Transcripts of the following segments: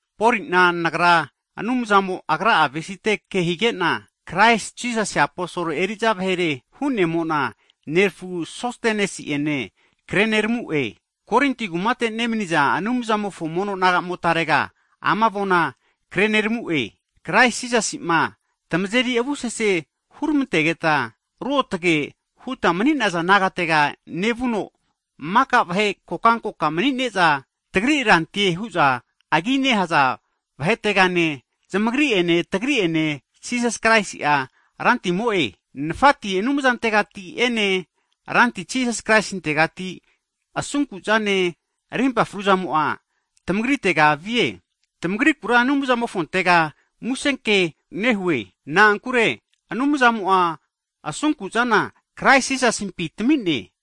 Poli'na nagra, Anumzamo Agra'a avesite Kraisi Jisasi aposol eri'za vahere hu'nemo'na nerafu Sostenesi'ene. Korinti kumate nemniza Anumzamofo mono nagamotarega, Kraisi Jisasi'ma tmazeri avusese hurmantegeta ruotge (saints) huta mani'naza nagatega nevuno, mika vahe kokankoka mni'ne'za, tagri Rantie hu'za agi nehaza vahetegane, zamagri ene tagri ene Jisas Kraisi'a Rantimofo kea kreneramune. Nafati, Anumzantegati ene, Ranti Jisas Kraistintegati asunkuzane, rimpa fruzamo'a tamagritega vie. Tamagrikura Anumzamofontega musenke huvava nehue, na'ankure Anumzamo'a asunkuzana, Kraisi Jisasimpi tami'ne.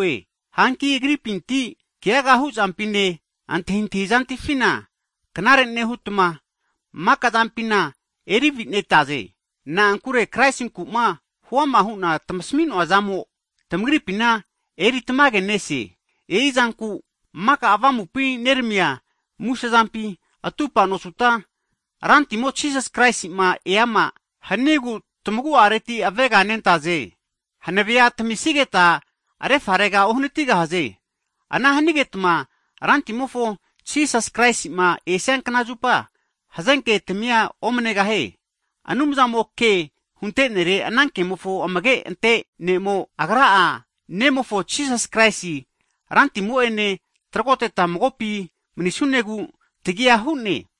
Hanki Agripinti, keaga hu'zampine, antahintahizatamifina knare nehutma, maka'zampina eri avi'netaze. Na'ankure Kraisinku'ma huama hu'na tamasmi'noazamo, tamagripina eritamage nese. E'izanku maka Avamupi neramia musezampina atupa nosuta, Rantimo Jisas Kraisi'ma eama hanigu, tamagu'areti aveganentaze. Hanavea tamisigeta refarera uhanatigahaze. Ana hanigetma Rantimofo Jisas Kraisi'ma esia kna zupa hazenke tamia omnegahie. Anumzamo'a ke hunte'nere ana kemofo amage'ante Ne'mo, Agra'a Nemofo Jisas Kraisi Rantimo'ene trogoteta magopi manisunegu, tagia hu'ne.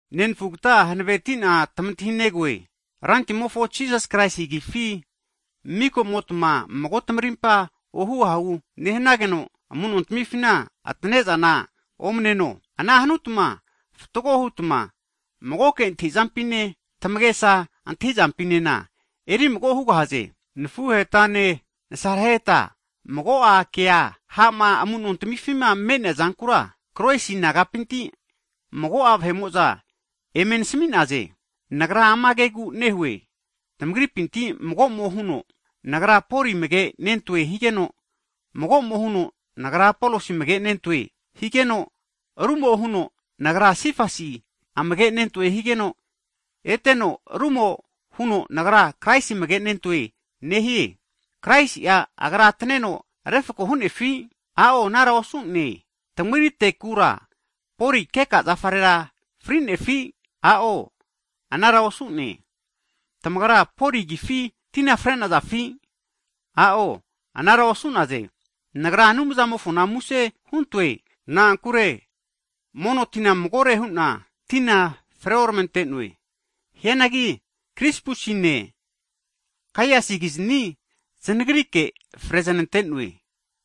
Nenafugata hanaveti'na tamantahinegoe, Rantimofo Jisas Kraisi agifi miko'motma mago tamarimpa ohunte ahunte nehanageno amu'nontamifi atane'zana omneno. Ana hanutma fatgo hutma magoke antahi'zampine, tamagesa antahi'zampinena eri mago hugahaze. Nafuhetane nasareheta, mago'a ke ha'ma amu'nontamifima me'nea zankura, Kloesi nagapinti mago'a vahe'mo'za eme nasmi'naze. Nagra ama kegu nehue, tamagripinti mago'mo huno, Nagra Poli amage'nentoe higeno, mago'mo huno nagra Apolosi amage'nentoe higeno, rumo'a huno, nagra Sifas (Pita) amage'nentoe higeno, eteno rumo'a huno, nagra Kraisi amage'nentoe nehie. Kraisti'a Agra ataneno refako hu'nefi? A'o anara osu'ne. Tamagritekura Poli keka zafarera fri'nefi? A'o anara osu'ne. Tamagra Poli agifi tina fre'nazafi? A'o anara osu'naze. Nagra Anumzamofona muse huntoe, na'ankure mono tina magore hu'na tina freormante'noe. Hianagi Krispusine Gaiusikizni zanagrike fre znante'noe.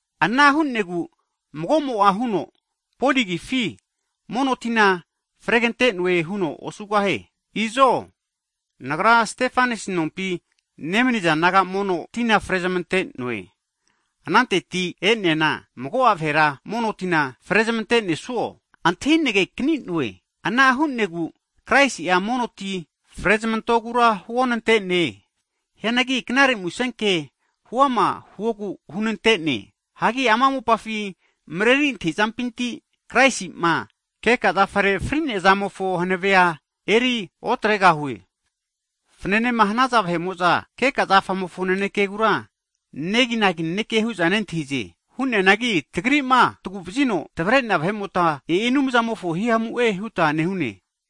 Ana hu'negu mago'mo'a huno Poli agifi mono tina fregante'noe huno osugahie. Izo, nagra Stefanasi nompi nemaniza naga mono tina frezamante'noe. Ananteti e'neana mago'a vahera mono tina frezmante'nesuo antahinagekani'noe. Ana hu'negu Kraisi'a mono ti frezamantogura huonante'ne. Hianagi knare musenke huama hanane huno hunante'ne. Hagi ama mopafi mreri antahi'zampinti, Kraisi'ma keka zafare fri'nea zamofo hanave'a eriotregahue. Fnanema hanaza vahe'mo'za keka zafamofo nanekegura neginagi naneke hu'za nentahize. Hu'neanagi tagri'ma tagu'vazino tavre'nea vahe'mota, e'i Anumzamofo himamu'e huta nehune.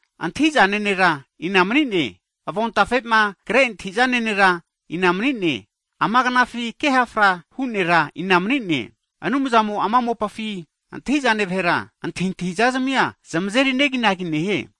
Antahi'zane nera ina mani'ne? Avontafe'ma kre antahi'zane nera ina mani'ne? Ama knafi ke hafra hu nera ina mani'ne? Anumzamo ama mopafi antahi'zane vahera, antahintahi'zazmia zmazeri neginagi nehie.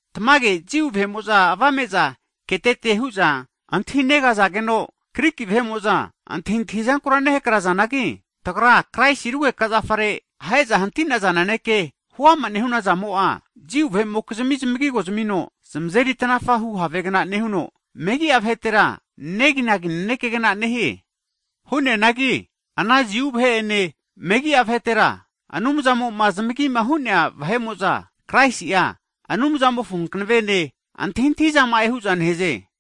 Tmage, Jiu vahe'mo'za avame'za ketete hu'za antahinegazageno, Griki vahe'mo'za antahintahi'zanku nehakrazanagi, tagra Kraisi rugeka zafare ahe'za hanti'naza naneke huama nehunazamo'a, Jiu vahe'mokizmia zmagigo zamino zmazeri tanafahu havegna nehuno, megi'a vahetera neginagi nanekegna nehie. Hu'neanagi, ana Jiu vahe ene megi'a (Griki) vahetera, Anumzamo'ma zamagima hu'nea vahe'mo'za, Kraisi'a Anumzamofo hankavene, antahintahizama'e hu'za nehaze.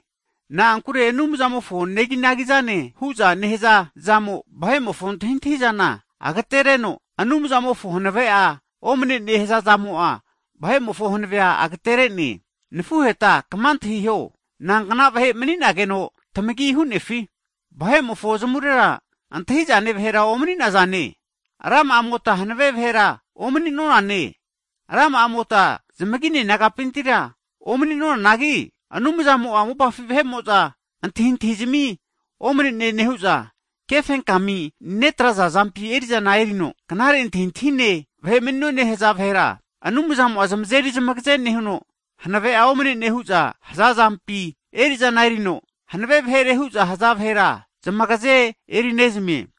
Na'ankure Anumzamofo neginagizane hu'za, nehaza zamo vahe'mofo antahintahizana agatenereno, Anumzamofo hanave'a omne'ne hazazamo'a vahe'mofo hanavea agatere'ne. Nafuheta kma antahiho, inankna vahe mani'nageno tamagia hu'nefi vahe'mofo zamurera antahi'zane vahera omni'nazane, rama'amota hanave vahera omani'nonane, rama'amota zmagine nagapintira omni'nonanagi, Anumzamo'a, mopafi vahe'mo'za antahintahizmi omane'ne nehu'za, kefenkami netraza vahepi erizana erino, knare antahintahine vahe mani'none haza vahera, Anumzamo'a zamazeri zamagaze nehuno, hanave'a omne'ne huza haza vahepi eri'zana erino, hanave vahere hu'za haza vahera zamagaze erinezmie.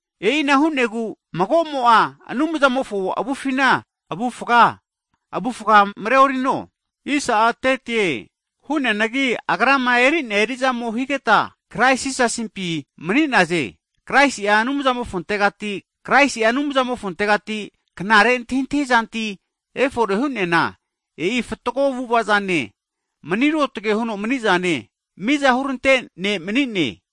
E'ina hu'negu mago'mo'a Anumzamofo avufina avufaga mareorigahie. Hu'neanagi, Agrama eri'nea eri'zamo higeta, Krais Jisasimpi mani'naze. Kraisi'a Anumzamofontegati knare antahintahi zantia efore hu'neana, e'i fatgo avu'ava'zane, mani ruotge huno mani'zane, miza hurante Ne' mani'ne.